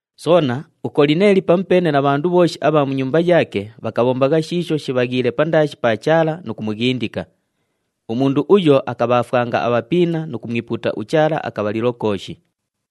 Soona, uKolineeli pamupeene na bhandu bhooshi abha mu nyumba yaake bhakabhombagha shiisho shibhaghiile pandaashi pa Chaala nu kumughindika. Umundu uyo akabhaafwanga abhapiina nu kumwipuuta uChaala akabhalilo kooshi.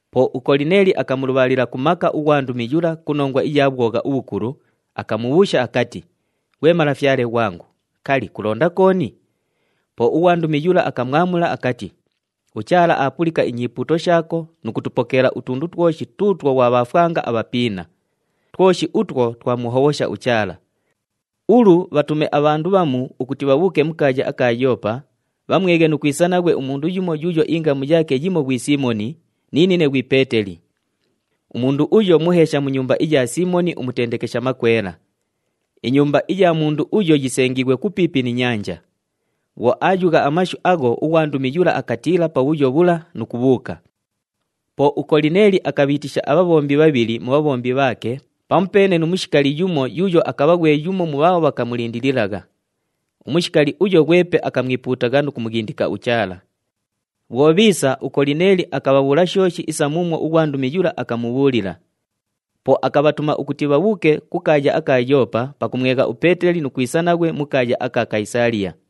Po uKolineeli akamulubhaalila ku maka ughwandumi yula ku nongwa iya bhwogha ubhukulu, akamubhuusha akati, “Ghwe malafyale ghwangu, kali, kulonda kooni?” Po ughwandumi yula akamwamula akati, “UChaala aapulika inyipuuto shaako nu kutupokeela utundu twoshi tuutwo ghwabhaafwanga abhapiina. Twoshi utwo twamuhobhosha uChaala. Ulu, bhatume abhandu bhamu ukuti bhabhuuke mu kaaya aka Yoopa, bhamweghe nu kwisa naghwe umundu yumo yuuyo ingamu yaake yimo ghwi Siimoni, ni nine ghwi Peeteli. Umundu uyo muheesha mu nyumba iya Siimoni umutendekesha makwela. Inyumba iya mundu uyo yisengiighwe kupiipi ni nyanja.” Bhwo aayugha amashu agho, ughwandumi yula akatiila pabhuyo bhula nu kubhuuka. Po uKolineeli akabhiitisha abhabhombi bhabhili mu bhabhombi bhaake pamupeene nu mushikali yumo yuuyo akabha ghwe yumo mu bhaabho bhakamulindililagha. Umushikali uyo ghwepe akamwipuutagha nu kumughindika uChaala. Bhwo bhiisa, uKolineeli akabhabhuula shooshi isa muumwo ughwandumi yula akamubhuulila. Po akabhatuma ukuti bhabhuuke ku kaaya aka Yoopa pakumwegha uPeeteli nu kwisa naghwe mu kaaya aka Kayisaaliya.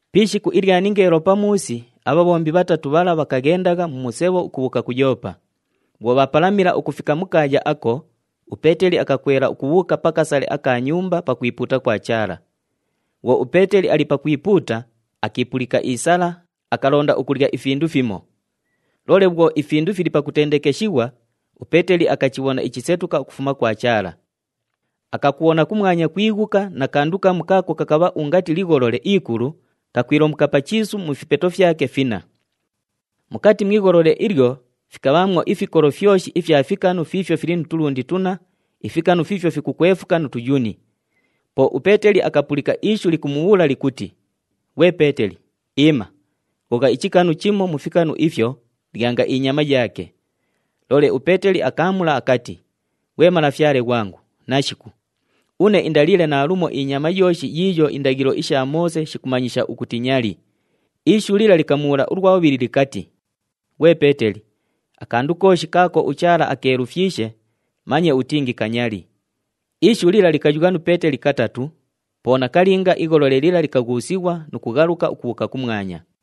Pi ishiku ilya ningeelo pamuusi, abhabhombi bhatatu bhala bhakaghendagha mu musebho ukubhuuka ku Yoopa. Bhwo bhaapalamila ukufika mu kaaya ako, uPeeteli akakwela ukubhuuka pa kasale aka nyumba pakwipuuta kwa Chaala. Bhwo uPeeteli ali pakwipuuta, akiipulika isala, akalonda ukulya ifindu fimo. Loole bhwo ifindu fili pakutendekeshighwa, uPeeteli akachibhona ichisetuka ukufuma kwa Chaala. Akakubhona kumwanya kwighuka na kandu kamu kaako kakabha ungati ligholole ikulu kakwilomuka pa chiisu mu fipeto fyake finna. Mukati mu igholole ilyo fikabhaamwo ifikolo fyoshi ifya fikanu fiifyo fili nu tulundi tunna, ifikanu fiifyo fikukwefuka nu tuyuni. Po uPeeteli akapulika ishu likumubhuula likuti, “Ghwe Peeteli, iima! Ghogha ichikanu chimo mu fikanu ifyo, lyanga inyama yaake!” Loole uPeeteli akaamula akati, “Ghwe Malafyale ghwangu, nashiku! Une indaliile naalumo inyama yooshi yiiyo indaghilo isha Moose shikumanyisha ukuti nyali.” Ishu lila likamubhuula ulwa bhubhili likati, “Ghwe Peeteli, akandu kooshi kaako uChaala akeelufyishe, manye utingi kanyali.” Ishu lila likayugha nu Peeteli katatu, po nakalinga igholole lila likaghuusighwa nu kughaluka ukubhuuka kumwanya.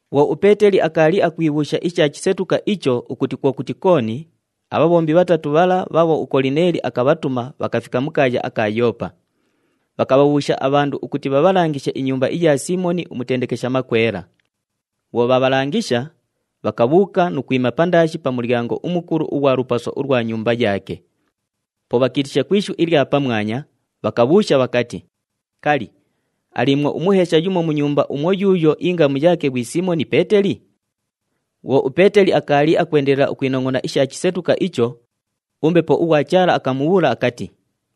Bhwo uPeeteli akaali akwibhuusha isha chisetuka icho ukuti kwo kuti kooni, abhabhombi bhatatu bhala bhaabho uKolineeli akabhatuma bhakafika mu kaaya aka Yoopa. Bhakabhabhuusha abhandu ukuti bhabhalangishe inyumba iya Siimoni umutendekesha makwela. Bhwo bhaabhalangisha, bhakabhuuka nu kwima pandaashi pa mulyango umukulu ughwa lupaso ulwa nyumba yaake. Po bhakiitisha ku ishu ilya pamwanya, bhakabhuusha bhakati, “Kali, aliimwo umuheesha yumo mu nyumba umwo yuuyo ingamu yaake ghwi Siimoni Peeteli?” Bhwo uPeeteli akaali akwendelela ukwinongʼona isha chisetuka icho, uMbepo ughwa Chaala akamubhuula akati,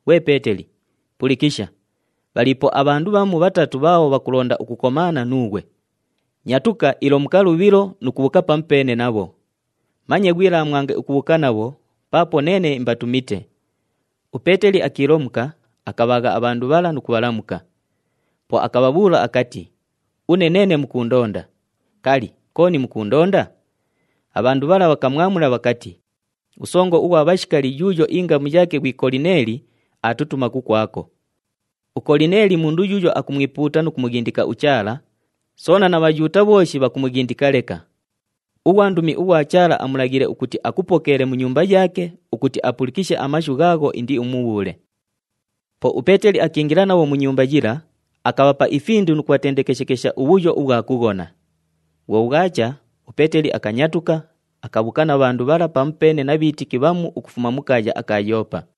“Ghwe Peeteli, pulikisha! Bhaliipo abhandu bhamu bhatatu bhaabho bhakulonda ukukomaana nuughwe. Nyatuka, ilomuka lubhilo nu kubhuuka pamupeene nabho! Manye ghwilaamwange ukubhuuka nabho paapo neene imbatumite!” UPeeteli akiilomuka, akabhaagha abhandu bhala nu kubhalamuka. Po akabhabhuula akati, “Une neene mukuundonda. Kali, kooni mukuundonda?” Abhandu bhala bhakamwamula bhakati, “Usongo ughwa bhashikali yuuyo ingamu yaake ghwi Kolineeli aatutuma kukwako. UKolineeli mundu yuuyo akumwipuuta nu kumughindika uChaala, soona na Bhayuuta bhooshi bhakumughindika leka. Ughwandumi ughwa Chaala amulaghiile ukuti akupokeele mu nyumba yaake ukuti apulikishe amashu ghaagho indiumubhuule.” Po uPeeteli akiingila nabho mu nyumba yila, akabhapa ifindu nu kubhatendekeshekesha ubhuyo ubhwa kughona. Bhwo bhwacha, uPeeteli akanyatuka, akabhuuka na bhandu bhala pamupeene na bhiitiki bhamu ukufuma mu kaaya aka Yoopa.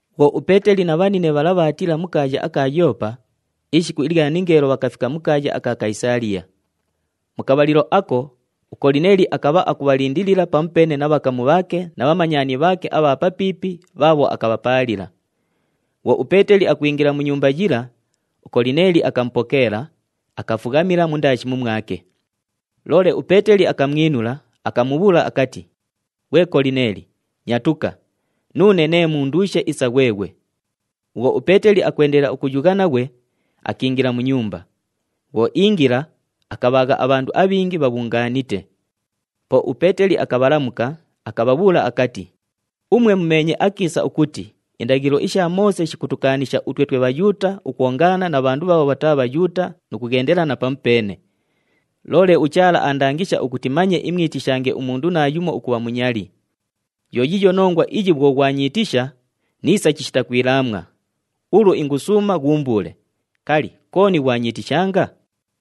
Bhwo uPeeteli na bhanine bhala bhaatiila mu kaaya aka Yoopa, ishiku ilya ningeelo bhakafika mu kaaya aka Kayisaaliya. Mu kabhalilo ako, uKolineeli akabha akubhalindilila pamupeene na bhakamu bhaake na bhamanyani bhaake abha papiipi bhaabho akabhapaalila. Bhwo uPeeteli akwingila mu nyumba yila, uKolineeli akamupokeela, akafughamila mundaashi mumwake. Loole uPeeteli akamwinula, akamubhuula akati, “Ghwe Kolineeli, nyatuka, nuune nee munduushe isa ghweghwe!” Bhwo uPeeteli akwendelela ukuyugha naghwe, akiingila mu nyumba. Bhwo iingila, akabhaagha abhandu abhingi bhabhungaanite. Po uPeeteli akabhalamuka, akabhabhuula akati, “Umwe mumeenye akiisa ukuti indaghilo isha Moose shikutukaanisha utwe twe Bhayuuta ukwongaana na bhandu bhaabho bhataa Bhayuuta nu kughendelana pamupeene. Loole uChaala aandangisha ukuti manye imwitishange umundu naayumo ukubha munyali. Yo yiiyo nongwa iyi bhwo ghwanyiitisha, niisa chishita kwilaamwa. Ulu ingusuuma ghuumbuule, kali, kooni ghwanyiitishanga?”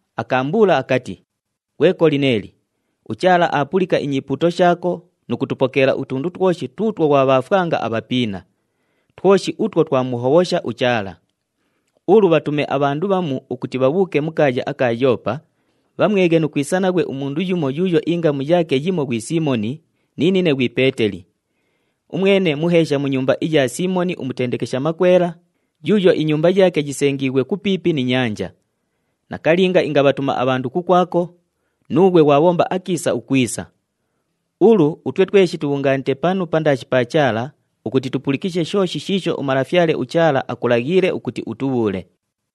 akaambuula akati, ‘Ghwe Kolineeli, uChaala aapulika inyipuuto shaako nu kutupokeela utundu twoshi tuutwo ghwabhaafwanga abhapiina. Twoshi utwo twamuhobhosha uChaala. Ulu bhatume abhandu bhamu ukuti bhabhuuke mu kaaya aka Yoopa, bhamweghe nu kwisa naghwe umundu yumo yuuyo ingamu yaake yimo ghwi Siimoni, ni nine ghwi Peeteli. Umwene muheesha mu nyumba iya Siimoni umutendekesha makwela, yuuyo inyumba yaake yisengiighwe kupiipi ni nyanja.’ Nakalinga ingabhatuma abhandu kukwako, nuughwe ghwabhomba akiisa ukwisa. Ulu utwe tweshi tubhungaanite panu pandaashi pa Chaala ukuti tupulikishe shooshi shiisho uMalafyale uChaala akulaghiile ukuti utubhuule.”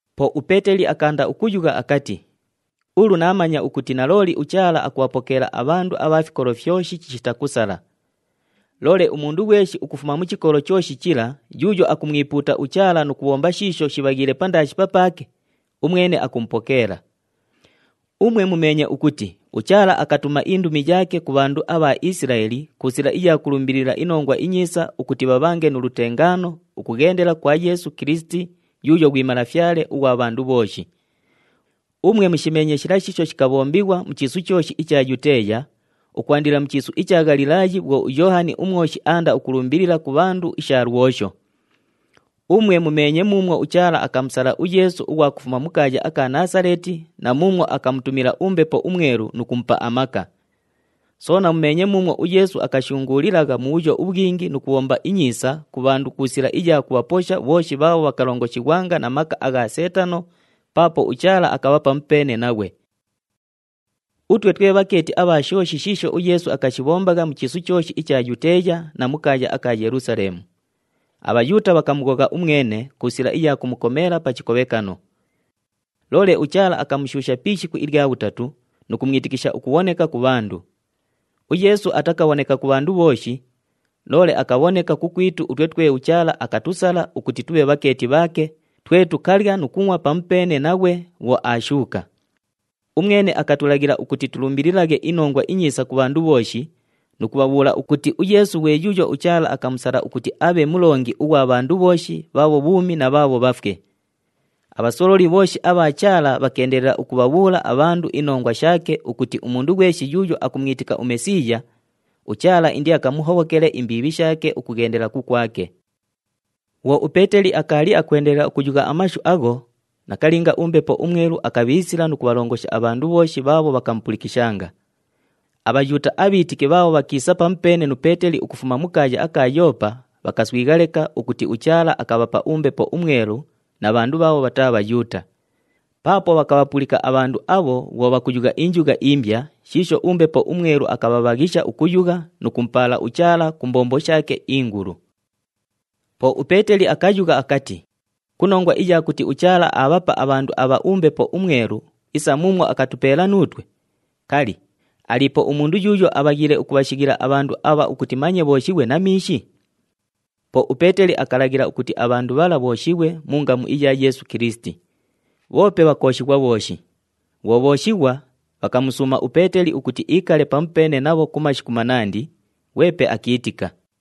Po uPeeteli akaanda ukuyugha akati, “Ulu naamanya ukuti nalooli uChaala akubhapokeela abhandu abha fikolo fyoshi chishita kusala. Loole umundu ghweshi ukufuma mu chikolo chooshi chila yuuyo akumwipuuta uChaala nu kubhomba shiisho shibhaghiile pandaashi papaake, umwene akumupokeela. Umwe mumeenye ukuti uChaala akatuma indumi yaake ku bhandu abha Isilaeli, ku sila iya kulumbilila iNongwa iNyiisa, ukuti bhabhange nu lutengaano ukughendela kwa Yeesu Kilisiti, yuuyo ghwi Malafyale ughwa bhandu bhooshi. Umwe mushimeenye shila shiisho shikabhombighwa mu chiisu chooshi icha Yuteeya ukwandila mu chiisu icha Ghalilaayi bhwo uYoohani uMwoshi aanda ukulumbilila ku bhandu isha lwosho. Umwe mumeenye muumwo uChaala akamusala uYeesu ughwa kufuma mu kaaya aka Naasaleeti, na muumwo akamutumila uMbepo uMwelu nu kumupa amaka. Soona mumeenye muumwo uYeesu akashunguulilagha mubhuyo ubhwingi nu kubhomba inyiisa ku bhandu, ku sila iya kubhaposha bhooshi bhaabho bhakalongoshighwanga na maka agha Seetano, paapo uChaala akabha pamupeene naghwe. “Utwe twe bhakeeti abha shooshi shiisho uYeesu akashibhombagha mu chiisu chooshi icha Yuteeya na mu kaaya aka Yelusaleemu. ABhayuuta bhakamughogha umwene ku sila iya kumukomeela pa chikobhekano. Loole uChaala akamushuusha pi ishiku ilya bhutatu nu kumwitikisha ukubhoneka ku bhandu. UYeesu atakabhoneka ku bhandu bhooshi, loole akabhoneka kukwitu utwe twe uChaala akatusala ukuti tubhe bhakeeti bhaake, twe tukalya nu kungʼwa pamupeene naghwe bhwo aashuuka. Umwene akatulaghila ukuti tulumbililaghe iNongwa iNyiisa ku bhandu bhooshi nu kubhabhuula ukuti uYeesu ghwe yuuyo uChaala akamusala ukuti abhe mulongi ughwa bhandu bhooshi bhaabho bhuumi na bhaabho bhafwe. Abhasololi bhooshi abha Chaala bhakeendelela ukubhabhuula abhandu inongwa shaake ukuti umundu ghweshi yuuyo akumwitika uMesiiya, uChaala indiakamuhobhokele imbiibhi shaake ukughendela kukwake.” Bhwo uPeeteli akaali akwendelela ukuyugha amashu agho, nakalinga uMbepo uMwelu akabhiisila nu kubhalongosha abhandu bhooshi bhaabho bhakamupulikishanga. ABhayuuta abhiitiki bhaabho bhakiisa pamupeene nu Peeteli ukufuma mu kaaya aka Yoopa bhakaswigha leka ukuti uChaala akabhapa uMbepo uMwelu na bhandu bhaabho bhataa Bhayuuta. Paapo bhakabhapulika abhandu abho bhwo bhakuyugha injugha imbya shiisho uMbepo uMwelu akabhabhaghisha ukuyugha nu kumupaala uChaala ku mbombo shaake ingulu. Po uPeeteli akayugha akati, “Ku nongwa iya kuti uChaala aabhapa abhandu abha uMbepo uMwelu isa muumwo akatupeela nuutwe, kali, aliipo umundu yuuyo abhaghiile ukubhashighila abhandu abha ukuti manye bhooshighwe na miishi?” Po uPeeteli akalaghila ukuti abhandu bhala bhooshighwe mu ngamu iya Yeesu Kilisiti. Bhoope bhakooshighwa bhooshi. Bhwo bhooshighwa, bhakamusuuma uPeeteli ukuti iikale pamupeene nabho ku mashiku manandi, ghwepe akiitika.